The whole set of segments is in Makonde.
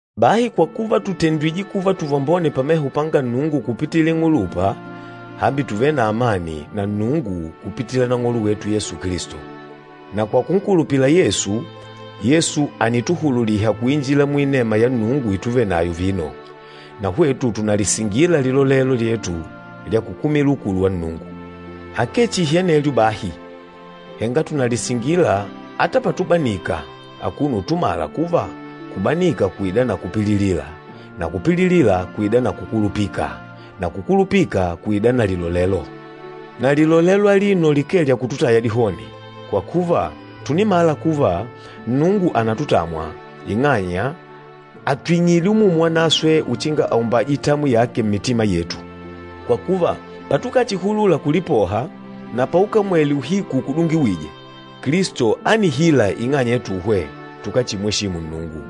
Bahi kwa kuva tùtendwije kuva tuvambone pameho panga Nnungu kupitila ing'ulupa, hambi tùvele na amani na Nnungu kupitila Nang'olo wetu Yesu Kilisto. Na kwa kunkulupila Yesu, Yesu ànituhululiha kuinjila muinema ya Nnungu ituvenayo vino, na hwetu tùnalisingila lilolelo lyetu lya kukumila ukulu wa Nnungu. Akee chihi anelyo bahi, henga tùnalisingila ata patubanika, akuno utumala kuva kubanika kùida na kupililila, na kupililila kùida na kukulupika na kukulupika kùida na lilolelo. Na lilolelo alino likee lya kututaya dihoni, kwa kuva tùnimala kuva Nnungu ànatutamwa, ing'anya àtwing'ile Umumu Wanaswe uchinga aumbaje itamwi yake mmitima yetu. Kwa kuva, patukachihulula kulipoha, na paukamwele uhiku ukudungiwîje, Kilisto ánihila ing'anya yatuhwe tukáchimweshimu Nnungu.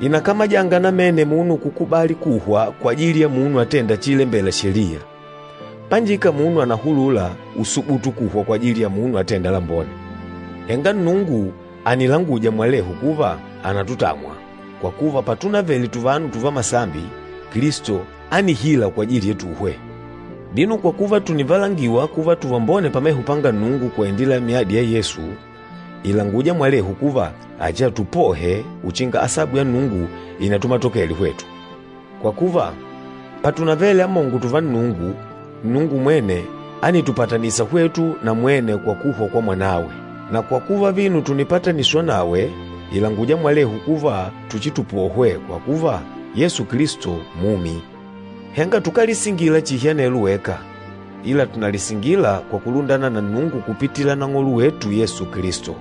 Ìnakamajanga namene munu kukubali kuhwa kwajili ya munu atênda chiilembela Sheliya. Panjika munu ànahulula usubutu kuhwa kwajili ya munu atênda lambone. Henga Nnungu ànilanguja mwalehu kuva ànatutamwa, kwa kuva patunavele tuvanu tuvamasambi, Kilisto ánihila kwajili yetuhwe. Vino, kwa kuva tùnivalangiwa kuva tuvambone pameho panga Nnungu kwa indila ya myadi ya Yesu, ìlanguja mwalehu kuva achiatupohe uchinga asabu ya Nnungu inatumatokele hwetu. Kwa kuva, patunavele amongo tuva Nnungu, Nnungu mwene ánitupatanisa hwetu na mwene kwa kuhwa kwa Mwanawe. Na kwa kuva vino tùnipataniswa nawe, ìlanguja mwalehu kuva tuchitupohwe, kwa kuva, Yesu Kilisto mumi. Henga tukálisingila chihi anelo weka, ila tùnalisingila kwa kulundana na Nnungu kupitila Nang'olo wetu Yesu Kilisto,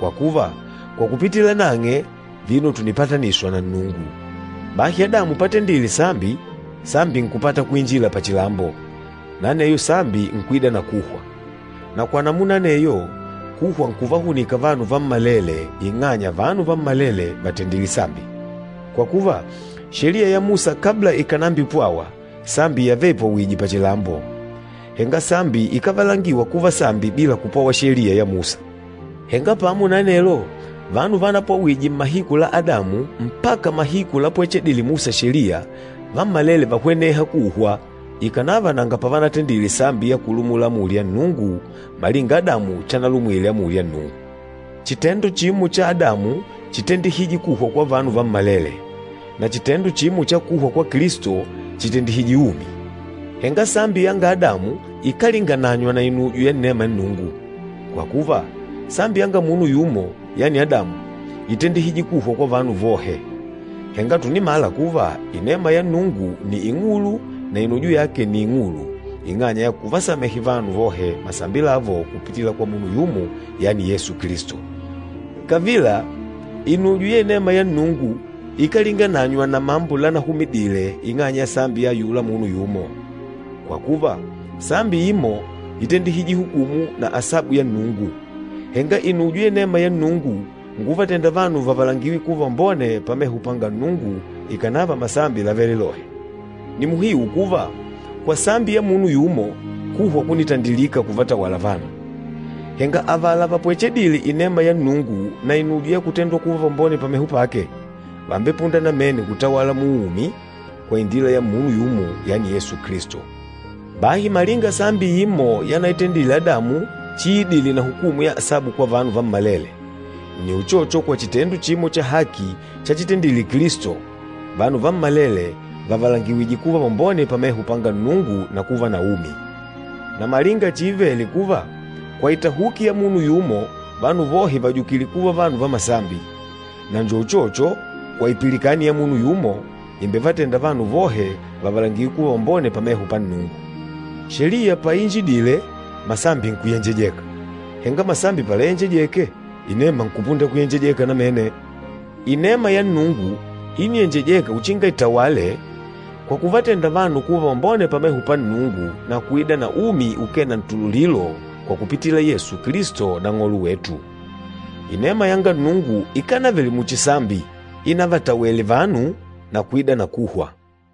kwa kuva, kwa kupitila nang'e, vino tùnipataniswa na Nnungu. Bahi Adamu patendile sambi, sambi nkupata kuinjila pachilambo, na aneyo sambi nkuida na kuhwa. Na kwa namuna aneyo, kuhwa nkuvahunika vanu vammalele, ing'anya vanu vammalele vàtendile sambi. Kwa kuva, Sheliya ya Musa kabla ikànambipwawa, sambi yavele ipwawìjè pachilambo, henga sambi ikávalangiwa kuva sambi bila kupwawa Sheliya ya Musa. Henga pamo na anelo, vanu vanapwawije mmahiku la Adamu mpaka mahiku lapwecheledile Musa Sheliya, vammalele vánihweneha kuhwa ikànava nanga pavanatendile sambi ya kulumula amuli ya Nnungu malinga Adamu chanalumwile amuli ya Nnungu. Chitendo chimo cha Adamu chítendihije kuhwa kwa vanu vammalele, na chitendo chimo cha kuhwa kwa Kilisto chìtendihije umi. Henga sambi yanga Adamu ikálingananywa na inujo ya inema ya Nnungu. Kwa kuva, sambi yanga munu yumo, yani Adamu, ítendihije kuhwa kwa vanu vohe, henga tùnimala kuva inema ya Nnungu nni ing'ulu na inujo yake nni ing'ulu ing'anya ya kuvasamehe vanu vohe masambi lavo kupitila kwa munu yumo, yani Yesu Kilisto. Kavila, inujo ya inema ya Nnungu ikálingananywa na mambo lanahumidile ing'anya ya sambi ya ayula munu yumo. Kwa kuva, sambi imo ítendihije hukumu na asabu ya Nnungu, henga inujo ya inema ya Nnungu nkuvatenda vanu vavalangiwe kuva vambone pameho panga Nnungu ikànava masambi lávele lohe. Ni muhiu kuva, kwa sambi ya munu yumo, kuhwa kúnitandilika kuvatawala vanu. Henga avala vapwechedîle inema ya Nnungu na inujo ya kutendwa kuva vambone pameho pake, vàmbepunda namene kutawala muumi kwa indila ya munu yumo, yani Yesu Kilisto. Bahi malinga sambi imo yanaitendile Adamu chiidile na hukumu ya asabu kwa vanu vammalele, nni uchocho kwa chitendo chimo cha haki chachitendile Kilisto, vanu vammalele vàvalangiwije kuva vambone pameho panga Nnungu na kuva na umi. Na malinga chiivele kuva, kwa itahuki ya munu yumo, vanu vohe vàjukile kuva vanu va masambi, na njo uchocho, kwa ipilikani ya munu yumo, ìmbevatenda vanu vohe vavalangiwe kuva vambone pameho pa Nnungu. Sheliya paiinjidile, masambi nkuyenjejeka, henga masambi palayenjejeke, inema nkupunda kuyenjejeka namene. Inema ya Nnungu íniyenjejeka uchinga itawale kwa kuvatenda vanu kuva vambone pameho pa Nnungu na kuida na umi ukee na ntululilo kwa kupitila Yesu Kilisto Nang'olo wetu. Inema yanga Nnungu ikánavele muchi sambi inavatawele vanu na kuida na kuhwa.